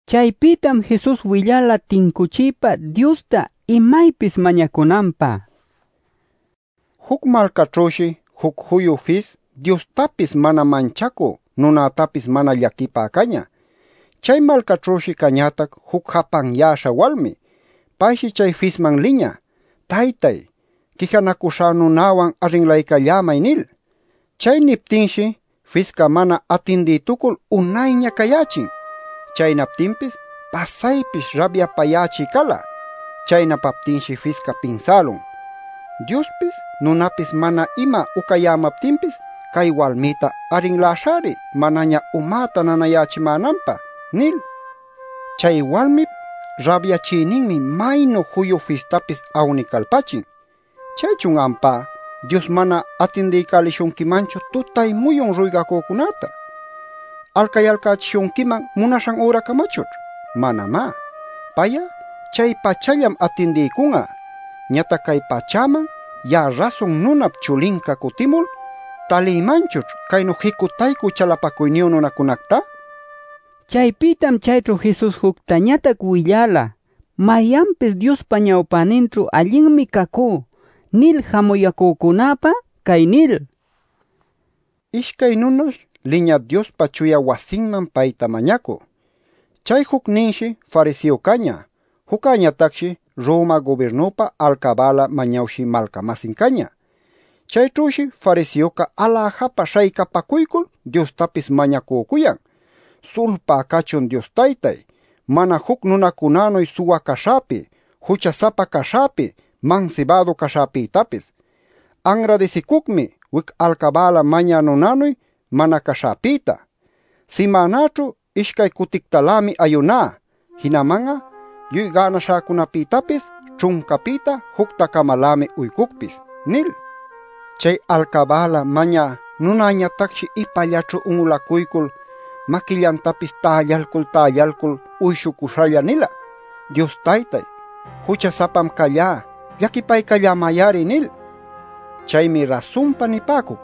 Chaypïtam Jesus willala tincuchiypa Diosta imaypis mañacunanpä: “Juc malcaćhüshi juc juyu fis Diostapis mana manchacü nunätapis mana llaquipä cañä. Chay malcaćhüshi cañätac juc japanyäśha walmi. Payshi chay fisman liñä: ‘Taytáy, quijanacuśhá nunäwan arrinlaycallämay’ nil. Chay niptinshi fisca mana atindïtucul unayña cayächin. Chaynaptinpis pasaypish rabyapayächï cala. Chaynapaptinshi fisca pinsälun: ‘Diospis nunapis mana ima ucayämaptinpis, cay walmïta arrinläśhäri manaña umäta nanayächimänanpä’ nil. “Chay walmip rabyachïninmi maynu juyu fistapis awnicalpachin. ¿Chaychun ampá Dios mana atindiycälishunquimanchu tutay-muyun ruygacücunäta? ¿Alcayalcächishunquiman munaśhan üracamachućh? Manamá. Pay'a chay-pachallam atindiycun'a. Ñatac cay pachäman ya'a Rasun Nunap Chulinca cutimul ¿talïmanchućh caynu jicutaycü chalapacuyniyu nunacunacta?” nila. Chaypïtam chayćhu Jesus juctañatac willala mayanpis “Diospa ñawpäninćhu allinmi cacú” nil jamuyäcücunäpä cay nil: “Ishcay nunash liñä Diospa chuya wasiman payta mañacü. Chay jucninshi fariseo cañä. Juccäñatacshi Roma gubirnupä alcabäla mañawshï malca-masin cañä. Chayćhüshi fariseoca aläjapa śhaycapacuycul Diostapis mañacücuyan: ‘Sulpá cachun Dios taytáy, mana juc nunacunänuy suwa caśhäpi, jucha-sapa caśhäpi, mansibädu caśhäpïtapis. Anradisicucmi wic alcabäla mañä nunänuy mana caśhäpïta. Simänäćhu ishcay cutictalämi ayuná. Jinaman'a lluy gänaśhäcunapïtapis ćhuncapïta jucta-camalämi uycucpis’ nil. “Chay alcabäla mañä nunäñatacshi ipallaćhu un'ulacuycul, maquillantapis tällalcul-tällalcul uyshucuśhalla nila: ‘Dios taytáy, jucha-sapam callá. Llaquipaycallämay-ari’ nil. Chaymi rasunpa nipäcuc,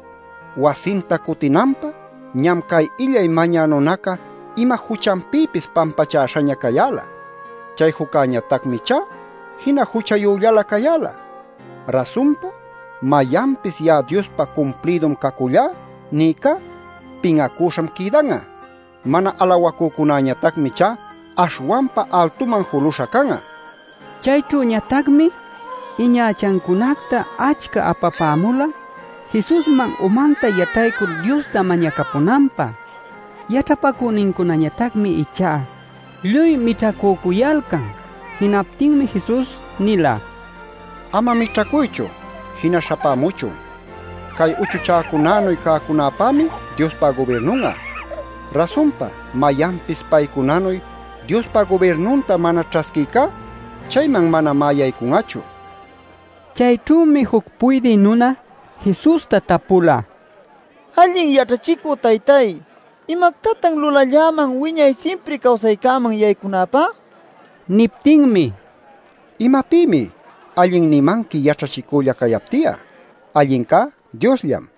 wasinta cutinanpä ñam cay illay mañä nunaca ima juchanpïpis pampachäśhaña cayäla. Chay juccäñatacmi ichá jina juchayüllalä cayäla. Rasunpa mayanpis ‘Ya'a Diospä cumplïdum cacullá’ nïcá pin'acüśham quïdan'a. Mana alawacücunañatacmi ichá aśhwanpa altuman juluśha can'a” nila. Chayćhüñatacmi iñachacunacta achca apapämula Jesusman umanta yataycul Diosta mañacapunanpä. Yaćhapacünincunañatacmi ichá lluy mićhacücuyalcan. Jinaptinmi Jesus nila: “Ama mićhacuychu; jina śhapämuchun. Cay uchuchäcunänuy cäcunapämi Diospa gubirnun'a. Rasunpa mayanpis paycunanuy Diospa gubirnunta mana ćhasquïcá, chayman manamá yaycun'achu” nila. Chayćhümi juc puydï nuna Jesusta tapula: “Allin yaćhachicü Taytay, ¿imactatan lulalläman wiñay simpri cawsaycäman yaycunäpä?” nil. Niptinmi: “¿Imapïmi ‘allin’ nimanqui yaćhachicülla cayapti'a? Allincá Diosllam.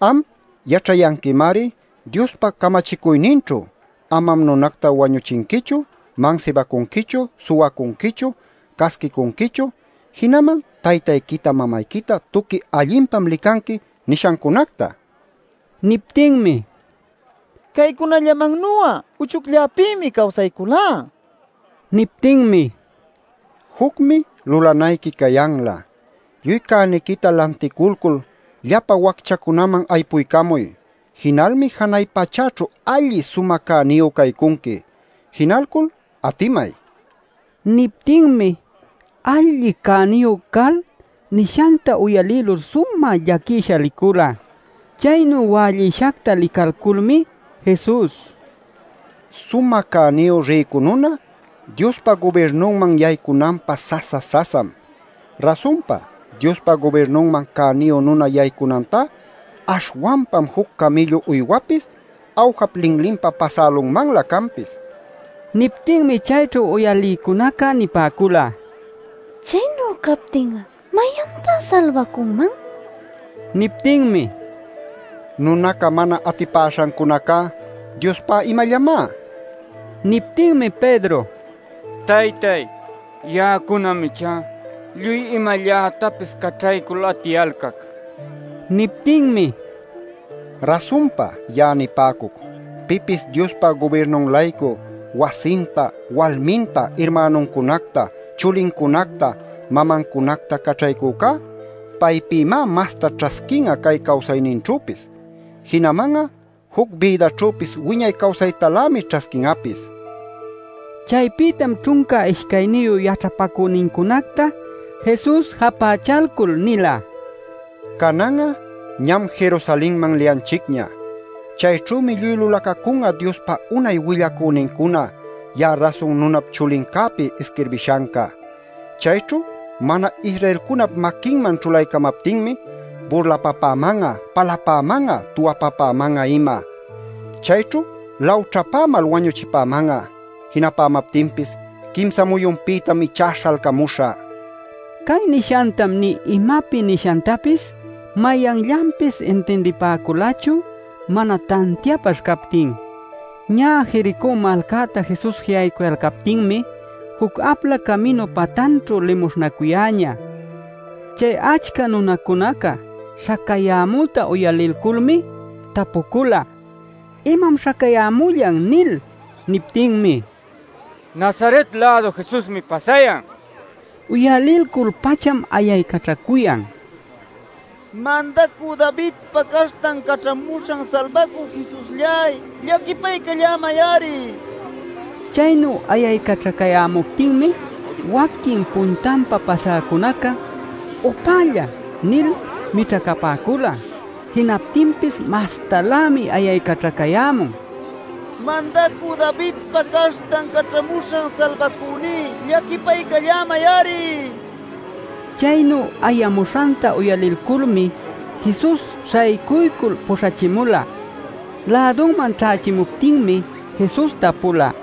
Am yaćhayanquimari Diospa camachicuyninćhu: ‘Amam nunacta wañuchinquichu; mansibacunquichu; suwacunquichu; casquicunquichu; jinaman taytayquita mamayquita tuqui allinpam licanqui’ nil nishancunacta” nin. Niptinmi: “Caycunallamannu'a uchucllapïmi cawsayculá” nila. Niptinmi: “Jucmi lulanayqui cayanlä: lluy cäniquita lanticulcul llapa wacchacunaman aypuycamuy. Jinalmi janay pachäćhu alli sumä cäniyu caycunqui. Jinalcul atimay” nila. Niptinmi alli cäniyu cal nishanta uyalïlul sumä llaquisha licula. Chaynu wällïshacta licalculmi Jesus: “Sumä cäniyu rïcu nuna Diospa gubirnunman yaycunanpä sasa-sasam. Rasunpa Diospa gubirnunman cäniyu nuna yaycunantá aśhwanpam juc camïllu uywapis awjap linlinpa pasälunmanlä canpis” nila. Niptinmi chayćhu uyalïcunaca nipäcula: “Chaynu captin'a ¿mayantá salbacunman?” nil. Niptinmi: “Nunaca mana atipäśhancunacá, Diospá imallamá” nila. Niptinmi Pedro: “Taytáy, ya'acunam ichá lluy imallätapis caćhaycul atiyalcac” nila. Niptinmi: “Rasunpa ya'a nipäcuc, pipis Diospa gubirnun-laycu wasinta, walminta, irmänuncunacta, chulincunacta, mamancunacta caćhaycücá paypïmá masta ćhasquin'a cay cawsayninćhüpis. Jinaman'a juc bïdaćhüpis wiñay cawsaytalämi ćhasquin'apis” nila. Chaypïtam ćhunca ishcayniyu yaćhapacünincunacta Jesus japächalcul nila: “Canan'a ñam Jerusalenman liyanchicña. Chayćhümi lluy lulacacun'a Diospa unay willacünincuna ya'a Rasun Nunap Chulincäpi isquirbishanca. Chayćhu mana-Israelcunap maquinman ćhulaycamaptinmi burlapapäman'a, palapäman'a, tuwapapäman'a ima. Chayćhu lawćhapämal wañuchipäman'a. Jinapämaptinpis quimsa muyunpïtam ichá śhalcamuśhä” nila. Cay nishantam nï imapi nishantapis mayanllanpis intindipäculachu mana tantiapaśh captin. Ñä Jericó malcäta Jesus ji'aycuyalcaptinmi juc apla caminu patanćhu limuśhnacuyäñä. Chay achca nunacunaca śhacayämüta uyalilculmi tapucula: “¿Imam śhacayämullan?” nil. Niptinmi: “Nazaret-lädu Jesusmi pasayan” nila. Uyalilcul-pacham ayaycaćhacuyan: “¡Mandacü Davidpa Caśhtan Caćhamuśhan Salbacü, Jesuslláy! ¡Llaquipaycallämay-ari!” nil. Chaynu ayaycaćhacayämuptinmi waquin puntanpa pasäcunaca: “¡Upälla!” nil mićhacapäcula. Jinaptinpis mastalämi ayaycaćhacayämun: “¡Mandacü Davidpa Caśhtan Caćhamuśhan Salbacüní! ¡Llaquipaycallämay-ari!” nil. Chaynu ayamuśhanta uyalilculmi Jesus śhaycuycul puśhachimula. Lädunman ćhächimuptinmi Jesus tapula: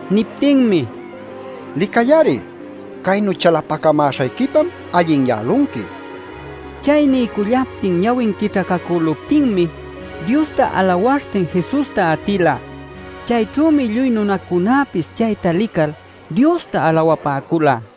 Niptinmi: “Licay-ari. Caynu chalapacamäśhayquipam allinyälunqui” nila. Chay niycullaptin ñawin quićhacacüluptinmi Diosta alawaśhtin Jesusta atila. Chayćhümi lluy nunacunäpis chayta lical Diosta alawapäcula.